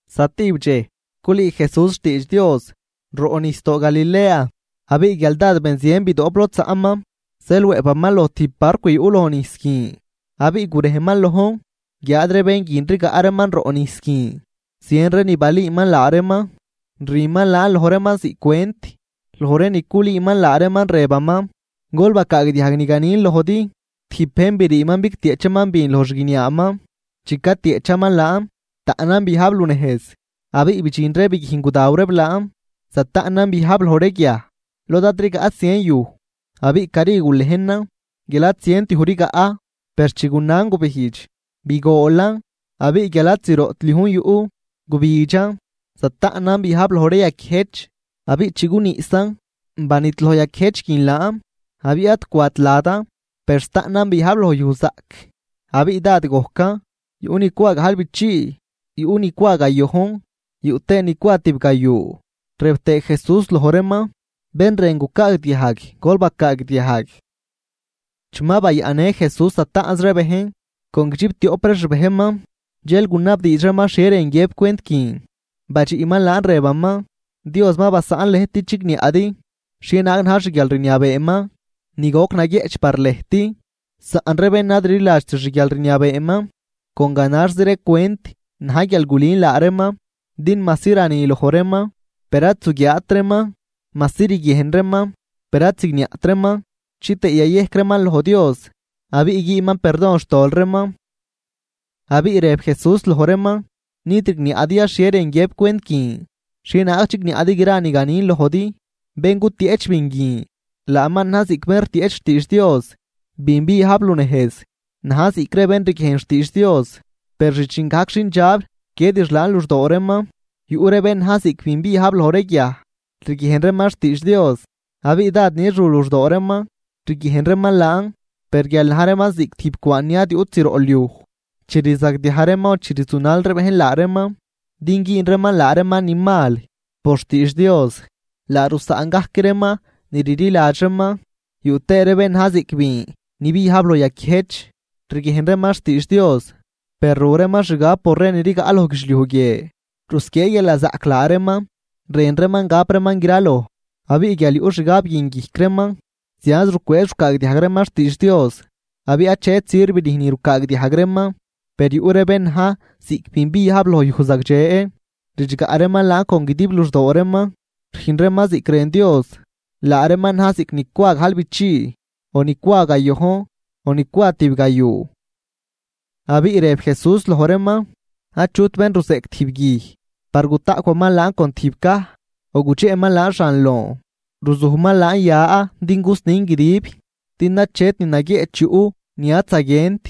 Zatijb dxej culüü Jesús xtiidx Dios roꞌnijsdoo Galilea. Abiꞌ guial dád benzien bidoꞌp lod zaꞌman zeel wëꞌpaman loj tijb barcw yuꞌ lojnijs guin, abiꞌ gurejman lojn guiáad ree bén guin rigaꞌ reeman roꞌ nijs guin. Zien ree ni balüüman laa reeman, rüman laan loj reeman ziꞌc cwent, loj ree ni culüüman laa reeman rëbaman: ―Gol bacaagdiajg ni ganin lojdi: Tijb bejn briiman bigtieꞌchaman bin loj xguiniaaman. Chi catieꞌchaman laan, taꞌnan biajb lunejz abiꞌ bidxin ree biguijn gudaw reeb laan. Zataꞌnan biajb loj ree guiaj lod ad rigaꞌt zien yuj, abiꞌ cari gulejnan guial ad zient yuj rigaꞌ. Per chi gunan gubijdx, bigoolan abiꞌ guial ad zroꞌt liujn yuꞌ, gubidxan. Zataꞌnan biajb loj ree yaquiëjch. Abiꞌ chi guniꞌsan, banidloj yaquiëjch guin laan, abiꞌ ad cwat ladan. Per zataꞌnan biajb loj yuj zaꞌc, abiꞌ dád gojcan, yuꞌ ni cwa gajlbichii, yuꞌ ni cwa gayojn yuꞌ tëë ni cwa tibgayuu. Rëb tëë Jesús loj reeman: ―Bén rën gucaagdiajg, gol bacaagdiajg. Chi ma bayaꞌnnë Jesús zataꞌnz ree bejn con guidxiptioꞌp ree xbejnman, dxel gunabdiidx reeman xhie rën guiëb cwent guin. Badxiꞌman laan rëbaman: ―Dios ma basaꞌn lëjt din chigniaꞌdi xhienaag na̱j xguialrniabeeman ni goc naguieꞌch par lëjt, saꞌn ree bén ad rliladxt xguialrniabeeman, con ganaxzi ree cwent na̱j guial gulün laa reeman. Din majsi rani loj reeman, per ad zuguiaat reeman, majsi riguiejn reeman, per ad zigniaꞌt reeman chitëë yayejc reeman loj Dios abiꞌ güünman perdon xtol reeman. Abiꞌ rëb Jesús loj reeman: ―¿Nid rigniaꞌdi ya xhie rën guiëb cwent guin? ¿Xhieza naag chigniaꞌdi gra ni ganin lojdi? Bén gutieꞌch bin guin, laaman na̱j ziꞌc bén rtieꞌch xtiidx Dios. Bin biajb lunejz, na̱j ziꞌc ree bén riguiejn xtiidx Dios, per rdxin gajc xindxab rquiedix laan luxdoo reeman. Yuꞌ ree bén na̱j ziꞌc bin biajb loj ree guiaj. Riguiejn reeman xtiidx Dios abiꞌ dád nix ru luxdoo reeman riguiejn reeman laan. Per guial na̱j reeman ziꞌc tijb cwaan ni ad yuꞌt zroꞌ liuj, chi rzagdiaj reeman o chi rzunal ree bejn laa reeman din güün reeman laa reeman ni mal por xtiidx Dios, laa rusaꞌn gajc reeman ni rliladx reeman. Yuꞌ tëë ree bén na̱j ziꞌc bin ni biajb loj yaquiëjch. Riguiejn reeman xtiidx Dios, per ru reeman xgab por ree ni rigaꞌ loj guidxliuj guie. Rusquiee guialnazaꞌc laa reeman rën reeman gap reeman graloj. Abiꞌ guial yuꞌ xgab guin guijc reeman, zianz rucwëëz rucaagdiajg reeman xtiidx Dios, abiꞌ achet sirv rüjn ni rucaagdiajg reeman. Per yuꞌ ree bén na̱j ziꞌc bin biajb loj yuj zagdxe, ridxgaꞌ reeman laan con guidib luxdoo reeman. Rüjn reeman ziꞌc rën Dios, laa reeman na̱j ziꞌc ni cwa gajlbichii o ni cwa gayojn o ni cwa tibgayuu. Abiꞌ rëb Jesús loj reeman: ―Achut bén ruzeꞌc tijb guij par gutaꞌcwaman laan con tijb caj, o gudxeꞌman laan xan loon, ruzujman laan ya din gusnin guidib. Din achet ni naguieꞌch yuꞌ ni ad zaguient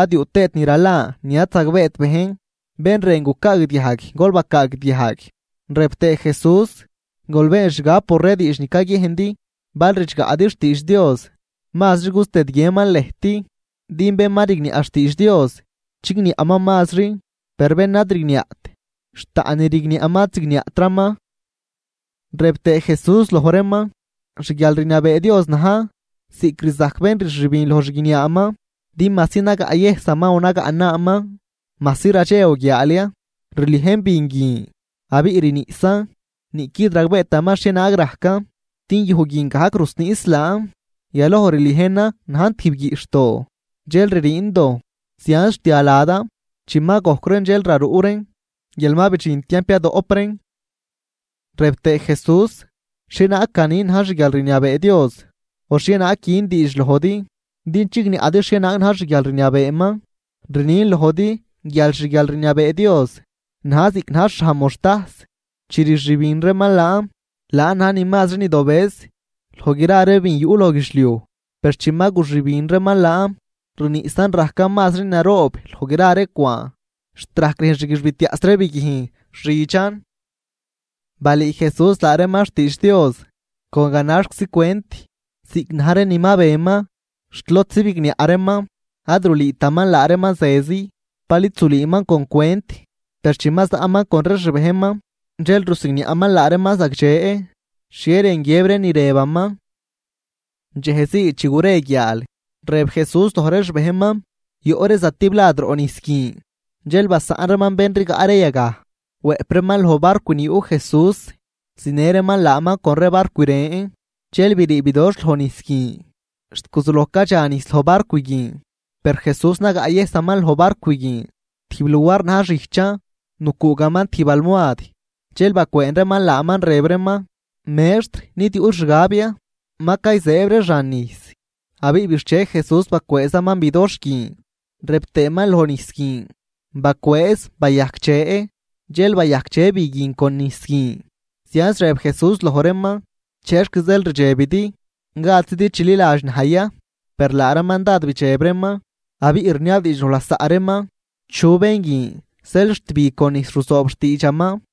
ad yuꞌ tëët ni ralan ni ad zagbeet bejn. Bén rën gucaagdiajg, gol bacaagdiajg. Rëb tëë Jesús: ―Gol been xgab por ree diidx ni caguiejndi. Bal ridxgaꞌdi xtiidx Dios, mazri gustëdguienman lëjt. Din bén ma rigniaꞌ xtiidx Dios, chigniaꞌman mazri. Per bén ad rigniaꞌt, xt taꞌn ni rigniaꞌman ad zigniaꞌtraman. Rëb tëë Jesús loj reeman: ―Xguialrniabee Dios na̱j ziꞌc rzajc bén rxübin loj xguiniaaman. Din majsi nagaꞌyëjsaman o nagaꞌnaaman, majsi radxe o guiaal ya, rliejn bin guin abiꞌ rniꞌsan, niꞌquid ragbeetaman xhienaag rajcan. Din yuj guin gajc rusniꞌs laan, yaloj rliejnan najn tijb guiꞌxhdoo, dxel ririin dojn, zianz rtia ladan. Chi ma gojc reen dxel raruꞌ reen guial ma bidxin tiamp yadoꞌp reen. Rëb tëë Jesús: ―¿Xhienaag ganin na̱j xguialrniabee Dios, o xhienaag gün diidx lojdi din chigniaꞌdi xhienaag na̱j xguialrniabeeman? Rnin lojdi guial xguialrniabee Dios na̱j ziꞌc na̱j xhaj moxtajs. Chi rxübin reeman laan. Laan na̱j ni mazri ni dobëz loj gra ree bin yuꞌ loj guidxliuj. Per chi ma guxübin reeman laan, rniꞌsan rajcan mazri naroob loj gra ree cwaan, xt rajc rüjn xguixbitiaꞌs ree biguijn xidxan. Balüü Jesús laa reeman xtiidx Dios con ganaxczi cwent ziꞌc na̱j ree ni ma beman, xt lodzi bigniaꞌ reeman. Ad rulüütaman laa reeman zezi, bal id zulüüman con cwent. Per chi ma zaꞌman con ree xbejnman dxel rusigniaꞌman laa reeman zagdxe xhie rën guiëb ree ni rëbaman. Dxej zii, chi gure guiaal, rëb Jesús loj ree xbejnman: ―Yoꞌ ree zatiblad roꞌ nijs guin. Dxel basaꞌn reeman bén rigaꞌ ree yagaj, wëꞌp reeman loj barcw ni yuꞌ Jesús zinë reeman laaman con ree barcw ren. Dxel brii bidoxh loj nijs guin, xt guzuloj cadxa nijs loj barcw guin. Per Jesús nagaꞌyëjsaman loj barcw guin tijb luar na̱j xijchan, nucuugaman tijb almoad. Dxel bacwëën reeman laaman rëb reeman: ―¡Mextr! ¿Nid yuꞌl xgab ya? ¡Ma cayzëëb ree xan nijs! Abiꞌ bixche Jesús, bacwëëzaman bidoxh guin rëb tëëman loj nijs guin: ―¡Bacwëëz, bayajcdxe! Dxel bayajcdxe bi guin con nijs guin. Zianz rëb Jesús loj reeman: ―¿Chexc zeel rdxebidi? ¿Gadzidi chililadx naj ya? Per laa reeman dád bidxeb reeman abiꞌ rniabdiidx loj lasaꞌ reeman: ―¿Chu bén guin zeel xt bi con nijs ruzoob xtiidxaman?